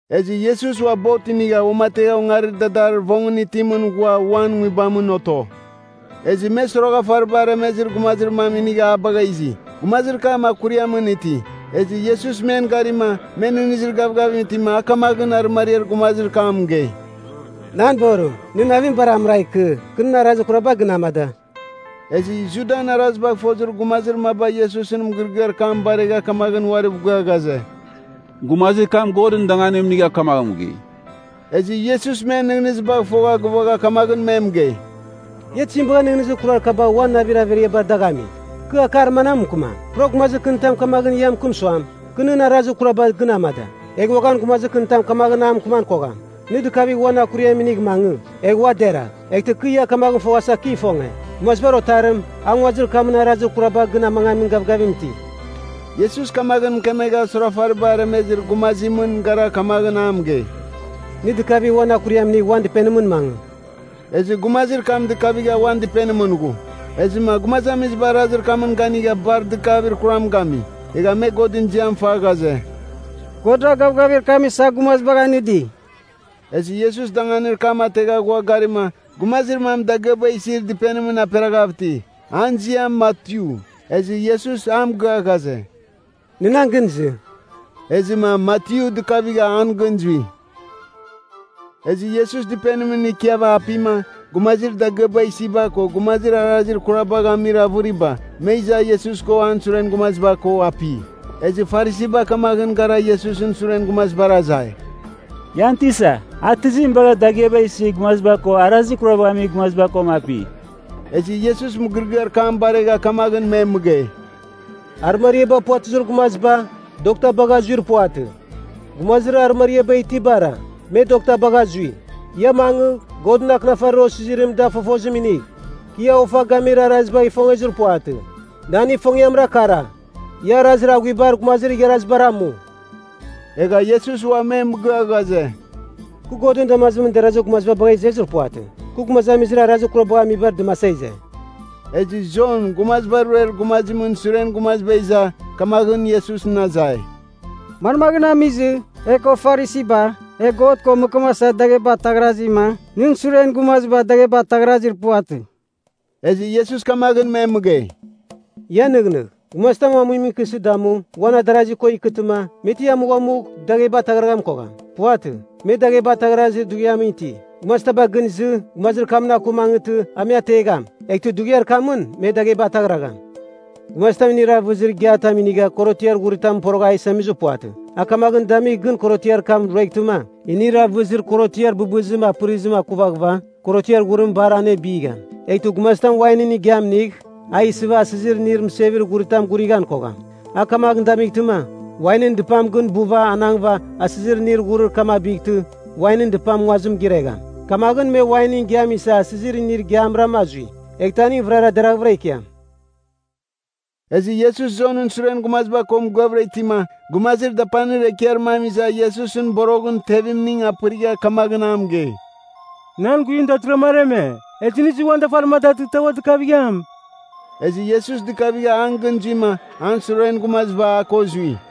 Ezɨ Iesus ua bot inigha uamategha ongarir dadarir vongɨn itimɨn ghua uan nguibamɨn oto. Ezɨ me soroghafariba aremezir gumazir mam inigha a bagha izi. Gumazir kam akuriamɨn iti. Ezɨ Iesus men garima, me nɨghnɨzir gavgavim itima, a kamaghɨn arɨmariar gumazir kam mɨgei, “Nan borim, nɨn navim bar amɨragh ikɨ. Kɨ nɨn arazir kuraba gɨn amada.” Ezɨ Judan arazibagh fozir gumazir maba Iesusɨn mɨgɨrɨgɨar kam baregha kamagh uariv gia ghaze, “Gumazir kam Godɨn danganim inigha kamaghɨn mɨgei.” Ezɨ Iesus men nɨghnɨzibagh fogha gɨvagha kamaghɨn me mɨgei, “Ia tizim bagha nɨghnɨzir kurar kaba uan navir averiabar dagh ami? Kɨ akar manam mɨkɨmam? Pura gumazir kɨnitam kamaghɨn a mɨkɨm suam, kɨ nɨn arazir kuraba gɨn amada. Egh uaghan gumazir kɨnitam kamaghɨn a mɨkɨman kogham, nɨ dɨkavigh uan akuriam inigh mangɨ, egh ua deragh. Eghtɨ kɨ ia kamaghɨn foghasa kɨ ifonge, Gumazibar Otarim, a nguazir kamɨn arazir kuraba gɨn amangamin gavgavim iti.” Iesus kamaghɨn mɨkemegha soroghafariba aremezir gumazimɨn gara kamaghɨn a mɨgei, “Nɨ dɨkavigh uan akuriam inigh uan dɨpenimɨn mangɨ!” Ezɨ gumazir kam dɨkavigha uan dɨpenimɨn ghu. Ezɨma gumazamiziba arazir kamɨn ganigha bar dɨgavir kuram gami. Egha me Godɨn ziam fa ghaze, “Godra gavgavir kam isa gumazibagh anɨdi.” Ezɨ Iesus danganir kam ategha ghua garima, gumazir mam dagɨaba isir dɨpenimɨn aperaghav iti. An ziam Matyu. Ezɨ Iesus a mɨgɨa ghaze, “Nɨ nan gɨn izɨ.” Ezɨma Matyu dɨkavigha an gɨn zui. Ezɨ Iesus dɨpenimɨn ikiava apima, gumazir dagɨaba isiba ko gumazir arazir kurabagha amir avɨriba, me iza Iesus ko an suren gumaziba ko api. Ezɨ Farisiba kamaghɨn gara Iesusɨn suren gumazibar azai, “Ian Tisa, a tizim bagha dagɨaba isir gumaziba ko arazir kurabagh amir gumaziba koma api?” Ezɨ Iesus mɨgɨrɨgɨar kam baregha kamaghɨn me mɨgei, “Arɨmariaba puvatɨzir gumaziba, dokta bagha zuir puvatɨ. Gumazir arɨmariaba itibara, me dokta bagha zui. Ia mangɨ, Godɨn Akɨnafarir osizirim da fofozim inigh. Kɨ ia ofa gamir arazibagh ifongezir puvatɨ. Nan ifongiamra kara, ia arazir aghuibar gumazir igharazibar amu.” Egha Iesus ua me mɨgɨa ghaze, “Kɨ Godɨn damazimɨn derazir gumaziba bagha izezir puvatɨ. Kɨ gumazamizir arazir kurabagh amibar dɨmasa ize!” Ezɨ Jon Gumaziba Ruer Gumazimɨn suren gumaziba iza, kamaghɨn Iesusɨn azai, “Manmaghɨn amizɨ, e ko Farisiba, e God ko mɨkɨmasa dagheba ataghrazima, nɨn suren gumaziba dagheba ataghrazir puvatɨ?” Ezɨ Iesus kamaghɨn me mɨgei, “Ia nɨghnɨgh. Gumazitam amuimɨn ikɨsɨ damu, uan adarazi ko ikɨtɨma, me ti amughamugh, dagheba ataghraghan kogham. Puvatɨ. Me dagheba ataghrazir dughiam iti. Gumazitaba gɨn izɨ, gumazir kamɨn aku mangɨtɨ, a me ategham, eghtɨ dughiar kamɨn me dagheba ataghragham. “Gumazitam inir avɨzir igiatam inigha korotiar ghuritam porogha a isamizir puvatɨ. A kamagh damigh gɨn korotiar kam rueghtɨma, inir avɨzir korotiar bɨbɨzim apɨrizim akuvaghɨva korotiar ghurim bar anebigham. Eghtɨ gumazitam wainɨn igiam inigh, a isɨva asɨzir inir mɨsevir ghuritam agurighan kogham. A kamaghɨn damightɨma, wainɨn dɨpam gɨn buva anangva asɨzir inir ghurir kam abightɨ, wainɨn dɨpam nguazim giregham. Eghtɨ wain ko asɨzir inim vɨrara ikuvigham. Kamaghɨn me wainɨn igiam isa asɨzir inir igiabaram azui, eghtɨ aning vɨrara deraghvɨra ikiam.” Ezɨ Iesus Jonɨn suren gumaziba ko mɨgɨavɨra itima, gumazir dapanir ekiar mam iza Iesusɨn boroghɨn tevemning apɨrigha kamaghɨn a mɨgei, “Nan guivim datɨrɨghrama areme, ezɨ nɨ izɨ uan dafarim a datɨghtɨma a ua dɨkavigham.” Ezɨ Iesus dɨkavigha an gɨn zuima, an suren gumaziba a ko zui.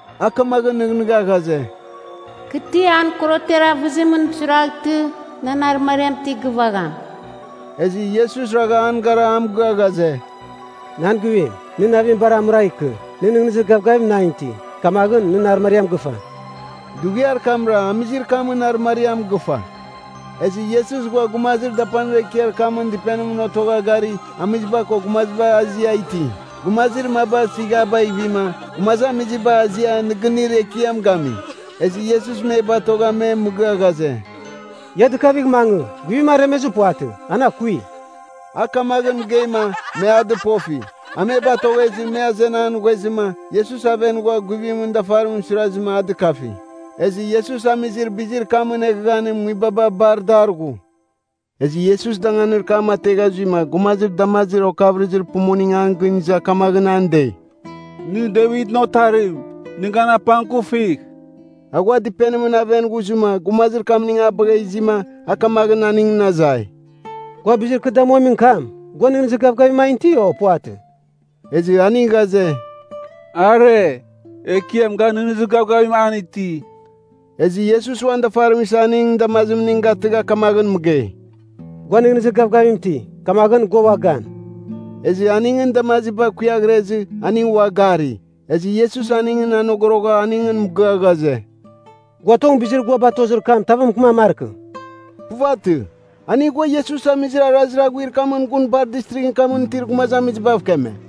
A kamaghɨn nɨghnɨgha ghaze, “Kɨ ti an korotiar avɨzimɨn suiraghtɨ, nan arɨmariam ti gɨvagham.” Ezɨ Iesus ragha an gara a mɨgɨa ghaze, “Nan guivim, nɨ navim bar amɨragh ikɨ. Nɨ nɨghnɨzir gavgavim nan iti, kamaghɨn, nɨn arɨmariam gɨfa.” Dughiar kamra, amizir kamɨn arɨmariam gɨfa. Ezɨ Iesus ghua gumazir dapanir ekiar kamɨn dɨpenimɨn otogha gari, amiziba ko gumaziba azia iti. Gumazir maba sɨghabagh ivima, gumazamiziba azia nɨgɨnir ekiam gami. Ezɨ Iesus me batogha me mɨgɨa ghaze, “Ia dɨkavigh mangɨ. Guivim aremezir puvatɨ. An akui.” A kamaghɨn mɨgeima, me a dɨpofi. A me batoghezɨ, me azenan ghuezɨma, Iesus aven ghua guivimɨn dafarimɨn suirazɨma, a dɨkafi. Ezɨ Iesus amizir bizir kamɨn eghaghanim nguibaba bar dar ghu. Ezɨ Iesus danganir kam ategha zuima, gumazir damazir okavɨrɨzir pumuning an gɨn iza kamaghɨn an dei, “Nɨ Devitɨn Otarim, nɨ gan apangkufigh.” A ghua dɨpenimɨn aven ghuzɨma, gumazir kamning a bagha izima, a kamaghɨn aningɨn azai. “Gua bizir kɨ damuamin kam, gua nɨghnɨzir gavgavim an iti, o puvatɨ?” Ezɨ aning ghaze, “Are, Ekiam ga nɨghnɨzir gavgavim an iti.” Ezɨ Iesus uan dafarim isa aningɨn damazimning gatɨgha kamaghɨn mɨgei, “Gua nɨghnɨzir gavgavim iti. Kamaghɨn, gua ua gan.” Ezɨ aningɨn damaziba kuiaghrezɨ, aning ua gari. Ezɨ Iesus aningɨn anogorogha aningɨn mɨgɨa ghaze, “Gua tong bizir gua batozir kam tavɨn mɨkɨman markɨ.” Puvatɨ. Aning ghua Iesus amizir arazir aghuir kamɨn gun bar distrighɨn kamɨn itir gumazamizibav keme.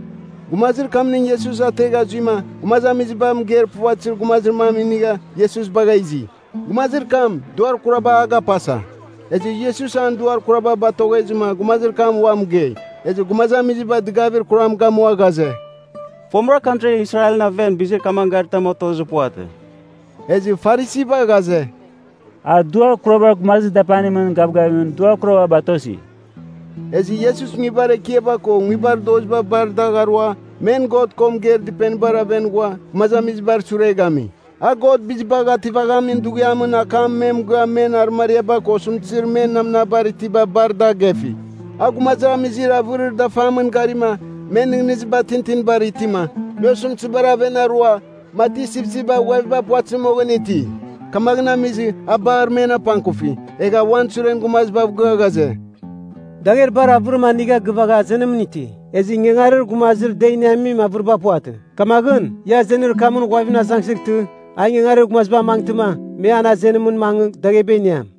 Gumazir kamning Iesus ategha zuima, gumazamiziba mɨgeir puvatɨzir gumazir mam inigha, Iesus bagha izi. Gumazir kam, duar kuraba a gapasa. Ezɨ Iesus an duar kuraba batoghezɨma, gumazir kam ua mɨgei. Ezɨ gumazamiziba dɨgavir kuram gamua ghaze, “Fomɨra, kantri Israelɨn aven, bizir kamagh garitam otozir puvatɨ.” Ezɨ Farisiba ghaze, “A duar kurabar gumazir dapanimɨn gavgavimɨn duar kuraba batosi.” Ezɨ Iesus nguibar ekiaba ko nguibar doziba bar dagh arua, men God ko mɨgeir dɨpenibar aven ghua, gumazamizibar sure gami. A God Bizibagh Ativamin Dughiamɨn akam me mɨgɨa men arɨmariaba ko osɨmtɨzir men namnabar itiba bar da gefi. A gumazamizir avɨrir dafamɨn garima, men nɨghnɨziba tintinibar itima, me osɨmtɨzibar aven arua, mati sipsipba ghuaviba puvatɨzir moghɨn iti. Kamaghɨn amizɨ, a bar men apangkufi. Egha a uan suren gumazibav gɨa ghaze, “Dagher bar avɨrim anigha gɨvagha azenimɨn iti. Ezɨ ingangarir gumazir da iniamin avɨriba puvatɨ. Kamaghɨn, ia azenir kamɨn ghuavimɨn azangsɨghtɨ, a ingangarir gumaziba amangtɨma, me an azenimɨn mangɨ, dagheba iniam.”